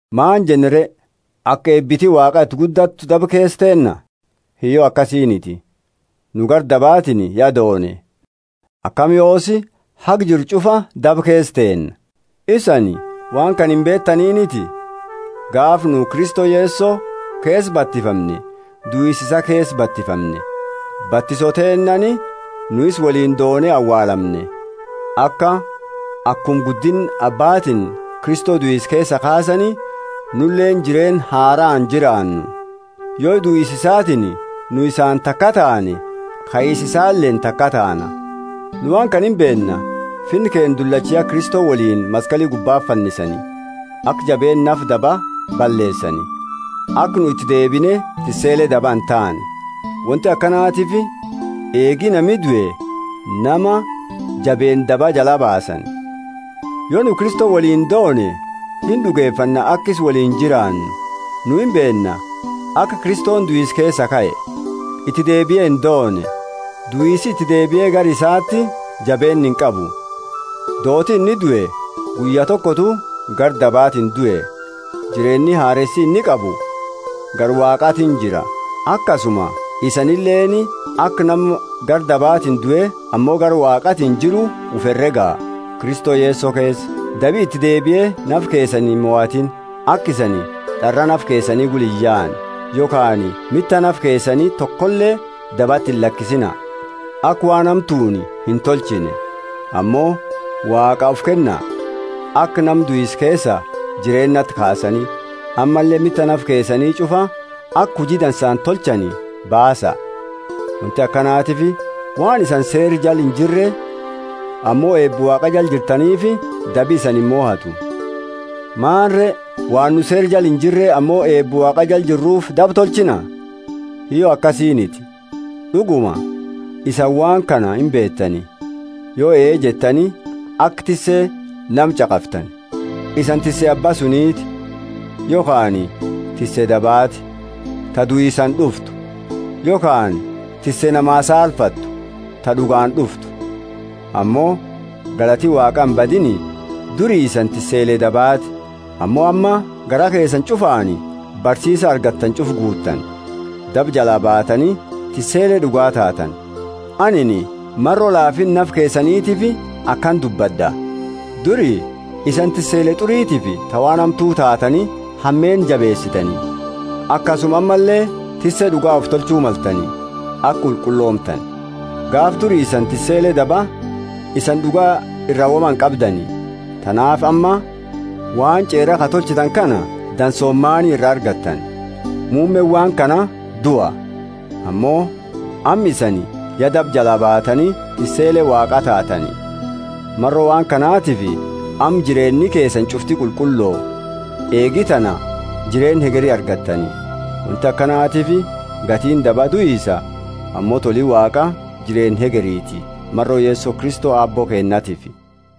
Maani jenna re? Aka eebiti Waaqa iti guddattu daba keesa teenna? Hiyyo, akasiiniti! Nu gara dabaatiini ya doone, akami yoosi haga jirru ch'ufa daba keesa teenna? Isani waan kana imbeetaniniti? Gaafa nu Kristo Yeso keesa batifamne duisa isaa keesa batifamne. Batiso teennaani nu isa woliini doone awaalamne, aka, akuma guddinna Abbatiini Kristo duisa keesaa kaasani, nuleeni jireenna haraani jiraannu. Yo duisa isaatiini nu isaani takaa taane, kaisa isaaleeni takaa taana. Nu waan kana imbeenna: finna keenna dullacha ya Kristo woliini maskali gubbati fannisani, aka jabeenna nafa dabaa balleesani, aka nu iti deebine tissele daba intaane. Wonti akanatiifi eegi nami due nama jabeenna dabaa jalaa baasani. Yo nu Kristo woliini doone ind'ugefanna aka isa woliini jiraannu. Nu imbeenna, aka Kristoni duisa keesaa kae, iti deebie indoone, duisi iti deebie gara isaati jabeenna inqabu. Dooti inni due guyya tokotu gara dabaatiini due; jireenni hareesi inni qabu gara Waaqaatiini jira. Akasuma isanileeni aka nama gara dabaatiini due ammo gara Waaqaatiini jiru ufi herega, Kristo Yeso keesa. Dabi iti deebie nafa keesani imohatiini, aka isani d'araa nafa keesani gula iyaane. Yokhaani mita nafa keesani tokole dabati illakisina, aka waan hamtuuni intolchine. Ammo Waaqaa ufi kenna, aka nama duisa keesaa jireennati kaasani, ammalle mita nafa keesani ch'ufa aka huji dansaani tolchani baasa. Wonti akanatiifi waan isani Seera jala injirre ammo eeba Waaqa jala jirtaniifi dabi isani imohatu. Maani re? Waan nu Seera jala injirre ammo eeba Waaqa jala jirruufi daba tolchina? Hiyyo, akasiiniti. D'uguma isani waan kana imbeetani: yo ee jettani aka tisse nama ch'aqaftani, isani tisse abba suniti, yokhaani tisse dabaati, ta duisaani d'uftu, yokhaani tisse namaa saalfatu ta d'ugaani d'uftu. Ammo galati Waaqa imbadiini! Duri isani tissele dabaati, ammo amma garaa keesani ch'ufaani barsiisa argattani ch'ufa guutani. Daba jalaa baattani tissele d'uga taatani. Anini maro laafinna nafa keesanitiifi akana dubbad'a. Duri isani tissele t'uritiifi ta waan hamtu taatani hameenna jabeesitani. Akasuma ammalle tisse d'uga ufi tolchu maltani, aka qulqulloomtani. Gaafa duri isani tissele daba, isani d'uga ira woma inqabdani. Tanaafi amma waan ch'eera ka tolchitani kana dansooma maani ira argattani? Muummeeni waan kana dua! Ammo amma isani ya daba jalaa baatani tissele Waaqaa taatani; maro waan kanatifi amma jireenni keesani ch'ufti qulqullo, eegi tana jireenna hegeri argattani. Wonti akanatiifi gatiini daba duisa; ammo toli Waaqa jireenna hegeriiti, maro Kristo Yeso Aabbo keennatiifi.